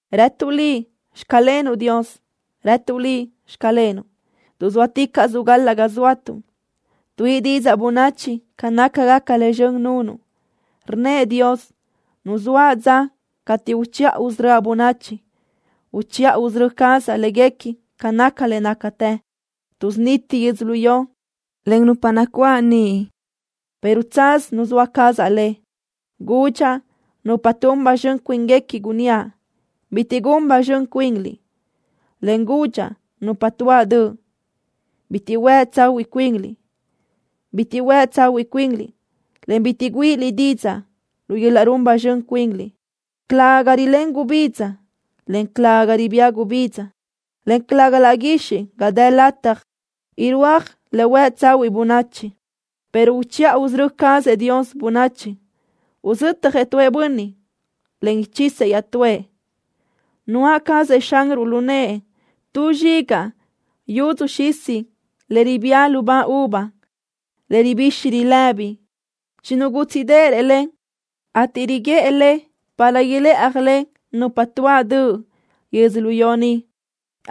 ¡Rëtuʼ Liʼ: “Xclenuʼ, Dios”! ¡Rëtuʼ Liʼ: “Xclenuʼ”, tuʼ zóaticaʼsuʼ gal-laʼ ga zóatuʼ! ¡Tuíʼi didzaʼ bönachi ca nácagaca le zxön nunuʼ! Rnnëʼ Dios: “Nuzóaʼ dza cateʼ uchiʼa usörö́aʼ bönachi. Uchiʼa usörö́ cazaʼ léguequi ca naca le nácatë. Tuʼsuniti yödzölió, en nupa nacuáʼ niʼ, pero tsaz nuzóa cazaʼ le.” Gudxaʼ nupa tun ba zxön cuínguequi, gunníaʼ: “Bitiʼ gun ba zxön cuinliʼ”, en gudxaʼ nupa tuáʼ döʼ: “Bitiʼ huë tsahuiʼ cuinliʼ. Bitiʼ huë tsahuiʼ cuinliʼ, en bitiʼ güíʼiliʼ didzaʼ lu yöl-laʼ run ba zxön cuinliʼ.” Calëga ga rilén gubidza, en calëga ga ribía gubidza, en calëga laʼ guixiʼ ga dë lataj irúaj le huë tsahuiʼ bönachi, pero uchiʼa usörö́ cazëʼ Dios bönachi. Uzötjëʼ tuëʼ bönniʼ, en uchisëʼ iaʼtúëʼ. Nuáʼ cazëʼ Xanruʼ lu nëʼë tu zxigaʼ yudzu xisa le ribía lubá uva le ribixi rilëbi. Chinugútsiʼdërëʼ le, ateʼ riguʼë le para ilëʼaj le nupa tuáʼ döʼ yödzölió ni,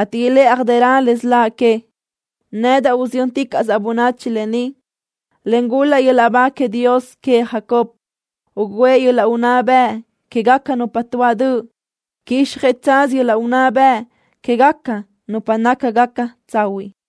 ateʼ ilë́ʼjadërö le siláʼ que. Nedaʼ usiyö́nticaʼsaʼ bönachi lë ni, en gul-laʼ yöl-laʼ ba queëʼ Dios queëʼ Jacob. Ugǘëʼ yöl-laʼ unná bëʼ quégaca nupa tuáʼ döʼ. Quíxjëʼ tsaz yöl-laʼ unná bëʼ quégaca nupa nácagaca tsahuiʼ.